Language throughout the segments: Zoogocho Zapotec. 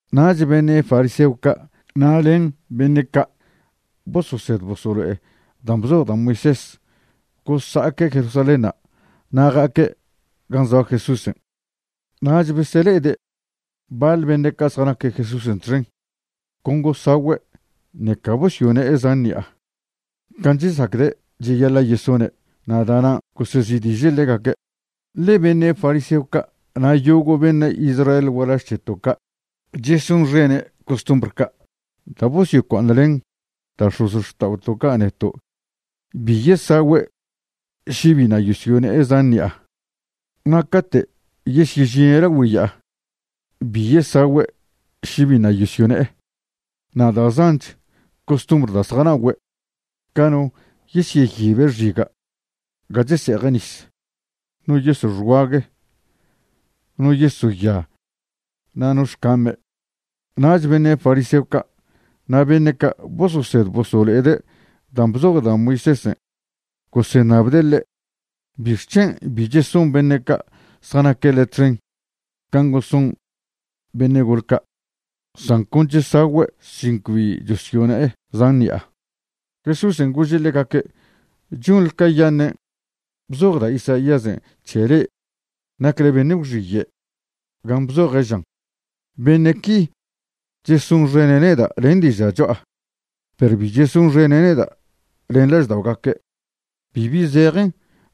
Nach beṉe' fariseo ca' na' len beṉe' ca' bososed bosolo'e dan' bzoj da' Moisés gosa'aque' Jerusalénṉa' na' ja'aque' gan' zoa Jesúsen'. Na' besele'ede' baḻ beṉe' ca' zjanaque' Jesúsen' txen con gosagüe' ṉeca bosyone'e zan ṉi'a can' chesacde' cheyaḻa' yesone', na' da'nan' gosezi'diže' ḻegaque'. (Ḻe beṉe' fariseo ca' na' yogo' beṉe' Israel gualaž c̱heto' ca' chesonxene' costumbr ca' da' bosyocua'aṉlen da' x̱ozxta'oto' ca' neto' bi yesagüe' še biṉa' yosyone'e zan ṉi'a. Na' cate' yesyežine' lagüe ya'a, bi yesagüe' še biṉa' yosyone'e, na' da' zanch costumbr da' zjana'ogüe', ca no yeseyibe' xiga' ga chese'eje' nis, no yeso' xguague, no yeso' ya na' no xcame'.) Nach beṉe' fariseo ca' na' beṉe' ca' bososed bosolo'ede' dan' bzoj da' Moisésen' goseṉabde' ḻe': ―¿Bixc̱hen' bi cheson beṉe' ca' zjanaque' le' txen can' goson beṉe' gol ca'? san con chesagüe' sin cbi chosyone'e zan ṉi'a. Jesúsen' gože' ḻegaque': ―Chonḻe cayaṉen' bzoj da' Isaíasen' c̱he le'e nacle beṉe' gwxiye' gan' bzoje', žan': Beṉe' qui chesonxene' neda' len diža' cho'a, perw bi chesonxene' neda' len lažda'ogaque'. Bibi zejen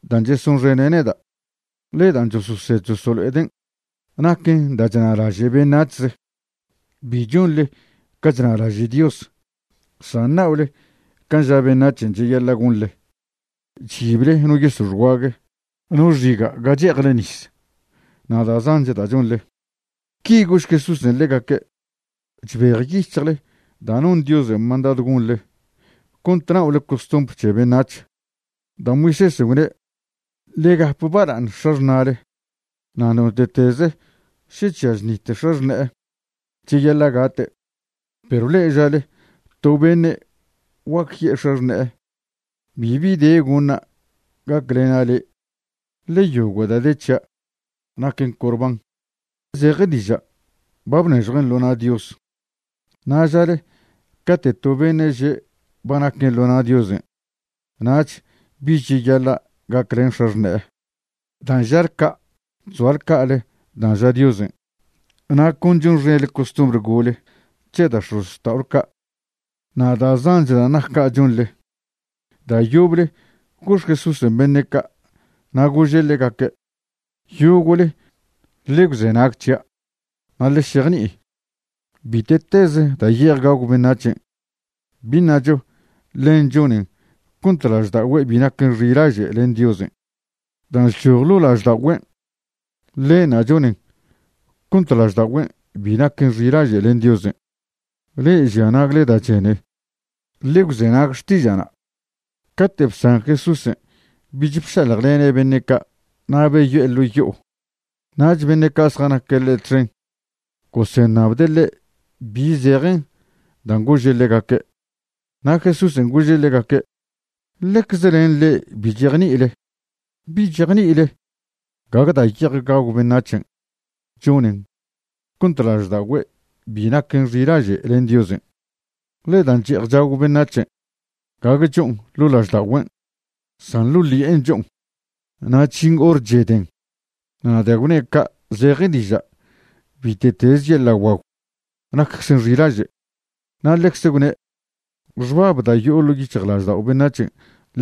dan' chesonxene' neda', ḻe dan' chososed chosolo'eden' naquen da' chnalaže' beṉac̱hze. Bi chonḻe ca chnalaže' Dios, san na'ole can' ža beṉac̱hen' cheyaḻa' gonḻe, chyible no yeso' xguague, no xiga' ga che'ejle nis, na' da' zanch da' chonḻe. Qui gožch Jesúsen' ḻegaque': ―Chbejyic̱hjle da' non Diosen' mandadw gonḻe cont na'ole costumbr c̱he beṉac̱h. Da' Moisésen' gwne': “Ḻe gap bala'aṉ x̱axṉa'le”, na' “Note'teze' še chžia chnite' x̱axṉe'e, cheyaḻa' gate'.” Perw le'e žale to beṉe' guac ye'e x̱axṉe'e: “Bibi de goṉa' gaclena' le'e, ḻe yogo' da' de c̱hia' naquen Corbán” (zeje diža', ba bnežjuen' ḻo na' Dios). Na' žale cate' to beṉe' že' ba naquen ḻo na' Diosen' nach bich cheyaḻa' gaclen x̱axṉe'e. Dan' žale ca' chzoale ca'ale dan' ža Diosen' na' con chonxenḻe costumbr gole c̱he da' x̱ozxta'ole ca'. Na' da' zanch dan' nac ca' chonḻe. Da' yoble gox Jesúsen' beṉe' ca', na' gože' ḻegaque': ―Yogo'le ḻe gwzenag c̱hia', na' ḻe šejni'i. Bite'teze da' ye'ej gagw beṉac̱hen', bi ṉacho ḻen chonen cont lažda'ogüe' bi naquen xilaže' len Diosen'. Dan' chchoj ḻo' lažda'ogüen', ḻenṉa' chonen cont lažda'ogüe' bi naquen xilaže' len Diosen'. Le'e žia nagle da' chene, ḻe gwzenag xtiža'na'. Cate' bsan Jesúsen' bich bšaljlene' beṉe' ca' na' beyo'e ḻo' yo'o, nach beṉe' ca' zjanaque' ḻe' txen goseṉabde' ḻe' bi zejen dan' gože' ḻegaque'. Na' Jesúsen' gože' ḻegaque': ―¿Ḻecze len le'e bi chejni'ile? ¿Bi chejni'ile gague da' ye'ej gagw beṉac̱hen' chonen cont lažda'ogüe' bi naquen xilaže' len Diosen'? Ḻe da' che'ej chagw beṉac̱hen' gague cho'on ḻo' lažda'ogüen', san ḻo' ḻi'en cho'on, na' chžin hor cheden. Na' da' gwne' ca' zeje diža' bite'teze yeḻa' guagw nacczen xilaže'. Na' ḻecze gwne': ―Xbab da' yo'o ḻo' yic̱hjlaždao' beṉac̱hen',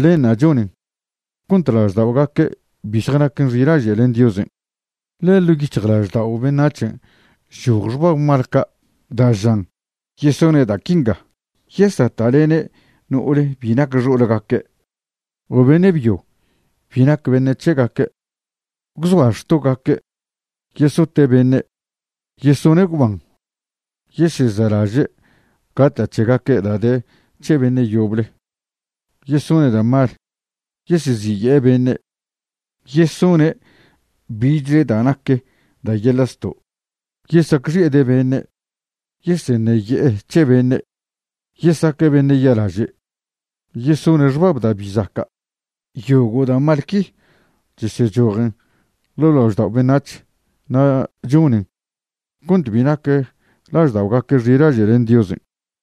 ḻenṉa' chonen cont lažda'ogaque' bi zjanaquen xilaže' len Diosen'. Ḻe ḻo' yic̱hjlaždao' beṉac̱hen' chchoj xbab mal ca da' žan yesone' da' quinga: yesata'lene' no'ole bi nac xo'olgaque' o beṉe' byo bi nac beṉe' c̱hegaque', gwzoa xtogaque', yesote' beṉe', yesone' gwban, yesezelaže' gata' c̱hegaque' da' de c̱he beṉe' yoble, yesone' da' mal, yeseziye'e beṉe', yesone' bichle da' nac da' yeḻa' zto', yesacxi'ede' beṉe', yeseṉeye'e c̱he beṉe', yesaque' beṉe' ya'laže', yesone' xbab da' bi zaca'. Yogo' da' mal qui chesechojen ḻo' laždao' beṉac̱h na' chonen cont bi nac lažda'ogaque' xilaže' len Diosen'.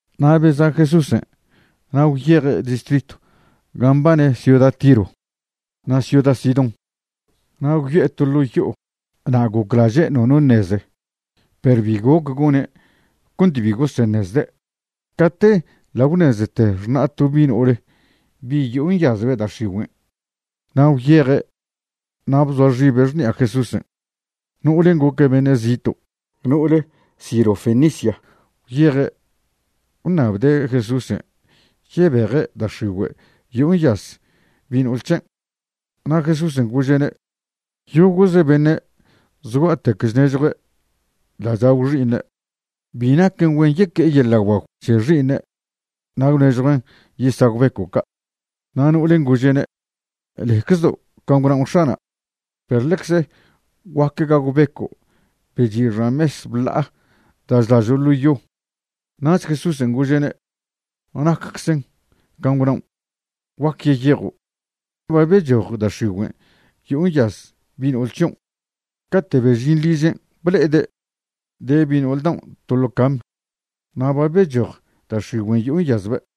Na' beza' Jesúsen' na' gwyeje' distritw gan' mbane ciuda Tiro na' ciuda Sidón. Na' gwyo'e to ḻo' yo'o na' goclaže' nono ṉeze, perw bi goc gone' cont bi goseṉezde'. Cate ḻa' gwṉezete xṉa' to bi' no'ole bi' yo'o nyazbe' da' x̱igüen', na' gwyeje' na' bzoa xibe' xṉi'a Jesúsen'. No'olen' goque' beṉe' zito', no'ole Sirofenicia. Gwyeje' gwṉabde' Jesúsen' yebeje' da' x̱igüe' yo'o nyaz bi' no'ol c̱hen'. Na' Jesúsen' gože'ne': ―Yogo'ze beṉe' zgua'tec chnežjue' da' chagw xi'iṉe'. Bi naquen güen yeque'e yeḻa' guagw c̱he xi'iṉe' na' gwnežjuen' yesagw beco' ca'. Na' no'olen' gože'ne': ―Leczedo' can' gwnaon' X̱ana', perw ḻecze guaque gagw beco' be chi' xan mes bla'a da' chlažo' ḻo yo. Nach Jesúsen' gože'ne': ―Nacczen can' gwnaon', guac yeyejo', ba bechoj da' x̱igüen' yo'o nyaz bi' no'ol c̱hion'. Cate' bežin ližen' ble'ede' de bi' no'ol daon' to ḻo cam, na' ba bechoj da' x̱igüen' yo'o nyazbe'.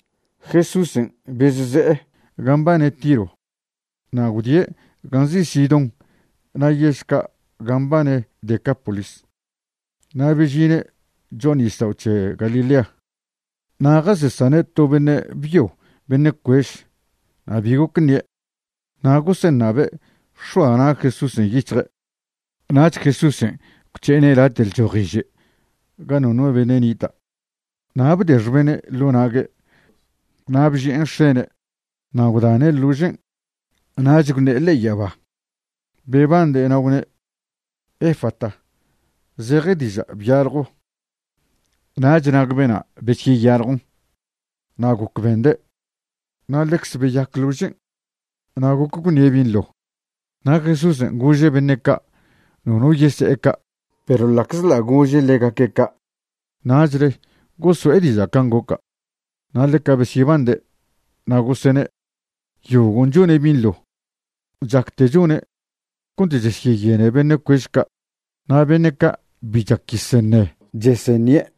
Jesúsen' bezse'e gan' mbane Tiro na' gwdie' gan' nzi' Sidón na' yež ca' gan' mbane Decápolis, na' bežine' cho'a nisdao' c̱he Galilea. Na' jasesane' to beṉe' byo beṉe' cuež na' bi goc ṉie', na' goseṉabe' x̱oa na' Jesúsen' yic̱hje'. Nach Jesúsen' gwc̱he'ene' late' lchojiže' ga nono beṉe' nita', na' bde xbene' ḻo' nague' na' bži'en x̱ene' na' gwdane' ḻožen'. Nach gwṉe'e ḻe'e yaba, bebande', na' gwne': ―¡Efata! ―zeje diža': ¡Byaljo! Nach nag bena' besyeyaljon na' goc bende', na' ḻecze beyac ḻožen' na' goc gwṉie' binḻo. Na' Jesúsen' gože' beṉe' ca' nono yese'e ca', perw ḻa'czḻa' gože' ḻegaque' ca', nachle goso'e diža' can' goca'. Na' ḻeca besyebande', na' gosene': ―Yogon' chone' binḻo; chacte chone' cont chesyeyene beṉe' cuež ca' na' beṉe' ca' bi chac yeseṉe' chesyeṉie'.